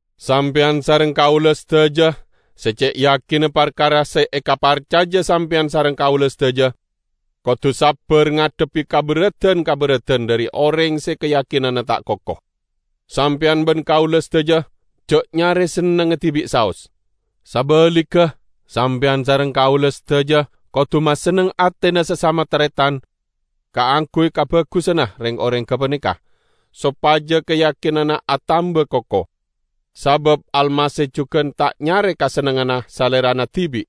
Sampeyan sareng kaula sadaja se ce' yakinna parkara se ekaparcaja sampeyan sareng kaula sadaja, kodu sabbar ngadhebbi kaberradan-kaberradan dhari oreng se kayakinanna ta' koko. Sampeyan ban kaula sadaja ja' nyare sennengnga dibi' saos. Sabaligga, sampeyan sareng kaula sadaja kodu masenneng atena sasama taretan kaangguy kabagusanna reng-oreng gapaneka, sopaja kayakinanna atamba koko. Sabab Almasih jugan ta' nyare kasennengnganna Salerana dibi'.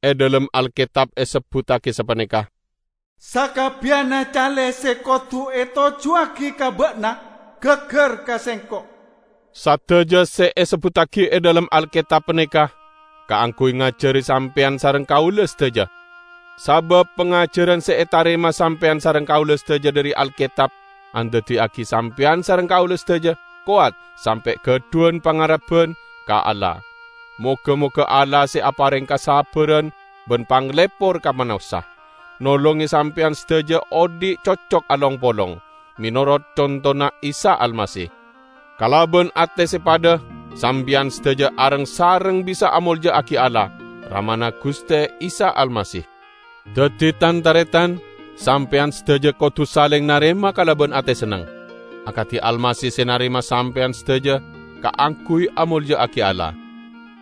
E dhalem Alketab esebbuttagi sapaneka. "Sakabbiyanna cale se kodu etojjuwagi ka Ba'na gaggar ka sengko'." Sadaja se esebbuttagi e dhalem Alketab paneka kaangguy ngajari sampeyan sareng kaula sadaja. Sabab pangajaran se etarema sampeyan sareng kaula sadaja dhari Alketab andaddiyagi sampeyan sareng kaula sadaja kowat sampe' gadhuwan pangarebban ka Allah. Moga-moga Allah se apareng kasabbaran ban panglepor ka manossa, nolonge sampeyan sadaja odhi' cocok along-polong, menorot contona Isa Almasih. Kalaban ate se padha sampeyan sadaja areng-sareng bisa amolja'agi Allah, Ramana Guste Isa Almasih. Daddi, tan-taretan, sampeyan sadaja kodu saleng narema kalaban ate senneng, akadi Almasih se narema sampeyan sadaja kaangguy amolja'agi Allah.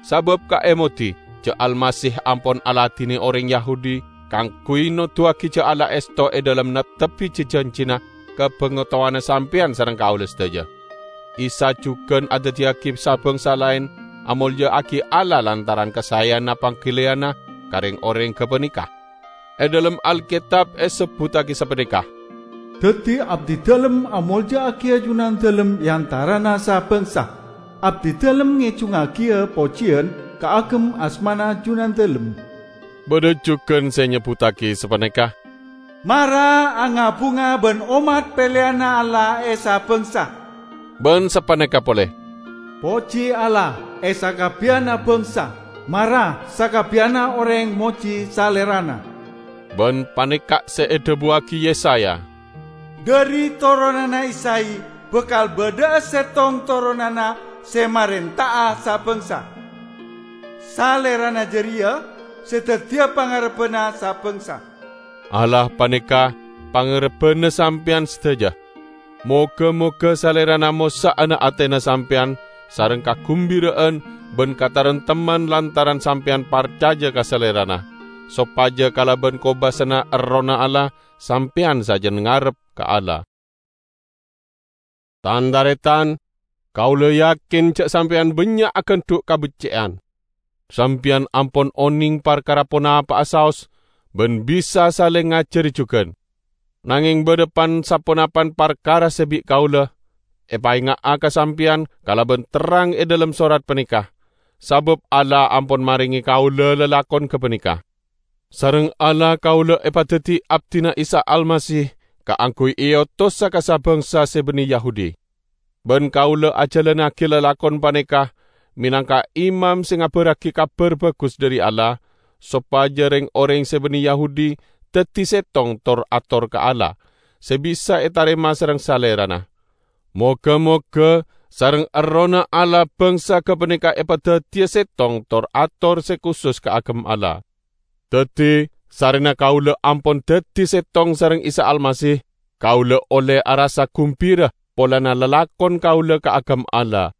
Sabab, kaemodi, ja' Almasih ampon aladine oreng Yahudi kaangguy noduwagi ja' Allah esto e dhalem neptebbi ji-janjina ka bangatowana sampeyan sareng kaula sadaja. Isa jugan andaddiyagi sa-bangsa laen amolja'agi Allah lantaran kasaeyanna panggaliyanna ka reng-oreng gapaneka. E dhalem Alketab esebbuttagi sapaneka, "Daddi abdidalem amolja'agiya Junandalem e antarana sa-bangsa, abdidalem ngejungngagiya pojiyan kaagem asmana Junandalem." Badha jugan se nyebbuttagi sapaneka, "Mara anga-bunga ban ommat peleyanna Allah, e, sa-bangsa!" Ban sapaneka pole, "Poji Allah, e sakabbiyanna bangsa, mara sakabbiyanna oreng moji Salerana!" Ban paneka' se edhabuwagi Yesaya, "Dhari toronanna Isay bakal badha'a settong toronanna se marenta'a sa-bangsa; Salerana jareya se daddiya pangarebbanna sa-bangsa." Allah paneka pangarebbanna sampeyan sadaja. Moga-moga Salerana mossa'ana atena sampeyan sareng kagumbira'an ban kataremtemman lantaran sampeyan parcaja ka Salerana, sopaja kalaban kobasana Errohna Allah sampeyan sajan ngarep ka Allah. Tan-taretan! Kaula yakin ja' sampeyan bannya' agandhu' kabecce'an. Sampeyan ampon oneng parkara ponapa'a saos ban bisa saleng ngajari jugan. Nangeng badha pan-saponapan parkara se bi' kaula epaenga'a ka sampeyan kalaban terrang e dhalem sorat paneka, sabab Allah ampon marenge kaula lalakon gapaneka. Sareng Allah kaula epadaddi abdina Isa Almasih kaangguy eotosa ka sa-bangsa se banne Yahudi. Ban kaula ajalannagi lalakon paneka menangka imam se ngabarragi Kabar Bagus dhari Allah, sopaja reng-oreng se banne Yahudi daddi settong tor-ator ka Allah, se bisa etarema sareng Salerana. Moga-moga sareng Errohna Allah bangsa gapaneka epadaddiya settong tor-ator se kusus kaagem Allah. Daddi, sarrena kaula ampon daddi settong sareng Isa Almasih, kaula olle arassa gumbira polana lalakon kaula kaagem Allah.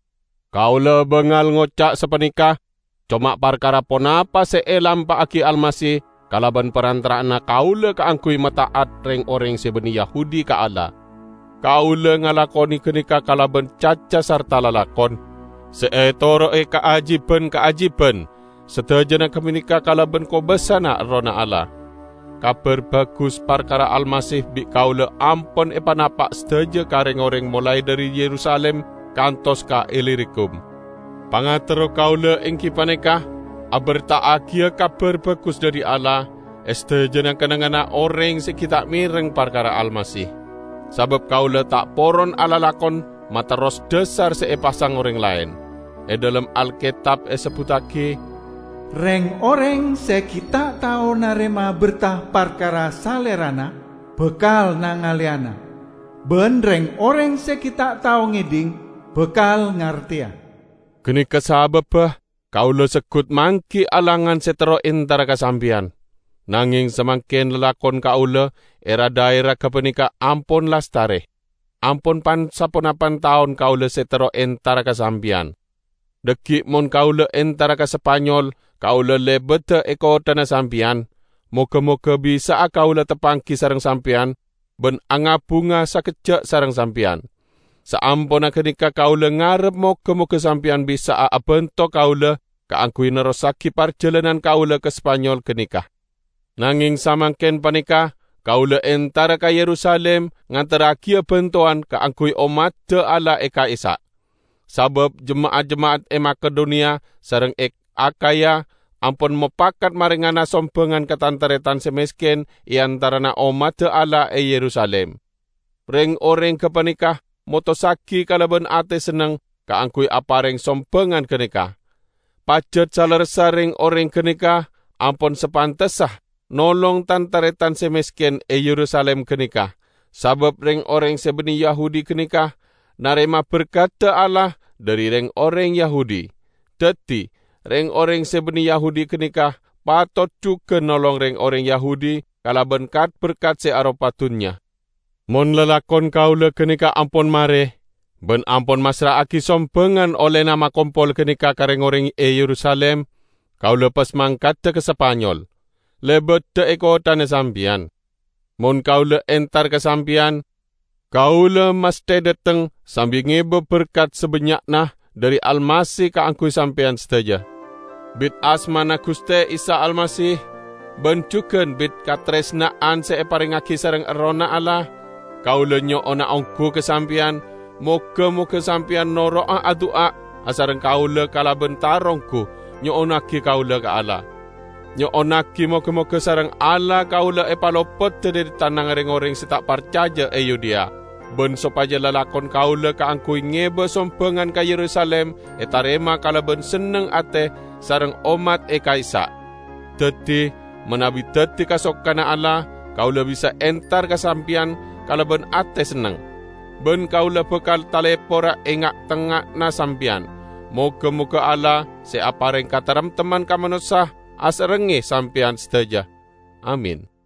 Kaula bangal ngoca' sapaneka coma parkara ponapa se elampa'agi Almasih kalaban parantara'anna kaula kaangguy mata'at reng-oreng se banne Yahudi ka Allah. Kaula ngalakone ganeka kalaban caca sarta lalakon, se etoro'e kaajiban-kaajiban; sadajana gapaneka kalaban kobasana Errohna Allah. Kabar Bagus parkara Almasih bi' kaula ampon epanapa' sadaja ka reng-oreng molae dhari Yerusalim kantos ka Ilirikum. Pangaterro kaula enggi paneka aberta'agiya Kabar Bagus dhari Allah e sadajana kennengnganna oreng se gi' ta' mereng parkara Almasih. Sabab kaula ta' poron alalakon materros dhasar se epasang oreng laen. E dhalem Alketab esebbuttagi, "Reng-oreng se gi' ta' tao narema berta parkara Salerana, bakal nangaleyana; ban reng-oreng se gi' ta' tao ngedhing, bakal ngarteya." Ganeka sababba kaula seggut manggi alangan se terro entara ka sampeyan. Nangeng samangken lalakon kaula e ra-dhaera gapaneka ampon lastare. Ampon pan-saponapan taon kaula se terro entara ka sampeyan. Dhaggi' mon kaula entara ka Spanyol kaula lebada e kotthana sampeyan; moga-moga bisa'a kaula tapanggi sareng sampeyan ban anga-bunga sakejja' sareng sampeyan. Saamponna ganeka kaula ngarep moga-moga sampeyan bisa'a abanto kaula kaangguy nerrossagi parjalanan kaula ka Spanyol ganeka. Nangeng samangken paneka kaula entara ka Yerusalim ngaterragiya bantowan kaangguy ommadda Allah e ka'issa'. Sabab jema'at-jema'at e Makedoniya sareng e Akhaya ampon mopakat marengana sombangan ka tan-taretan se mesken e antarana ommadda Allah e Yerusalim. Reng-oreng gapaneka motossagi kalaban ate senneng kaangguy apareng sombangan ganeka. Pajat salerressa reng-oreng ganeka ampon sapantessa nolong tan-taretan se mesken e Yerusalim ganeka; sabab reng-oreng se banne Yahudi ganeka narema berkadda Allah dhari reng-oreng Yahudi. Daddi, reng-oreng se banne Yahudi ganeka patot jugan nolong reng-oreng Yahudi kalaban kat-berkat se aropa dunnya. Mon lalakon kaula ganeka ampon mare, ban ampon masra'agi sombangan ollena makompol ganeka ka reng-oreng e Yerusalim, kaula pas mangkada ka Spanyol, lebada e kotthana sampeyan. Mon kaula entar ka sampeyan, kaula masthe dhateng sambi ngeba berkat sabannya'na dhari Almasih kaangguy sampeyan sadaja. Bit asmana Guste Isa Almasih, ban jugan bit kataresna'an se eparengngagi sareng Errohna Allah, kaula nyo'ona onggu ka sampeyan, moga-moga sampeyan noro'a adu'a asareng kaula kalaban taronggu, nyo'onnagi kaula ka Allah. Nyo'onnagi moga-moga sareng Allah kaula epalopoda dhari tanangnga reng-oreng se ta' parcaja e Yudea, ban sopaja lalakon kaula kaangguy ngeba sombangan ka Yerusalim etarema kalaban senneng ate sareng ommat e ka'issa'. Daddi, manabi daddi kasokanna Allah, kaula bisa entar ka sampeyan kalaban ate senneng. Ban kaula bakal talepora e nga'-tengnga'anna sampeyan. Moga-moga Allah, se apareng kataremtemman ka manossa, asarengnge sampeyan sadaja. Amin.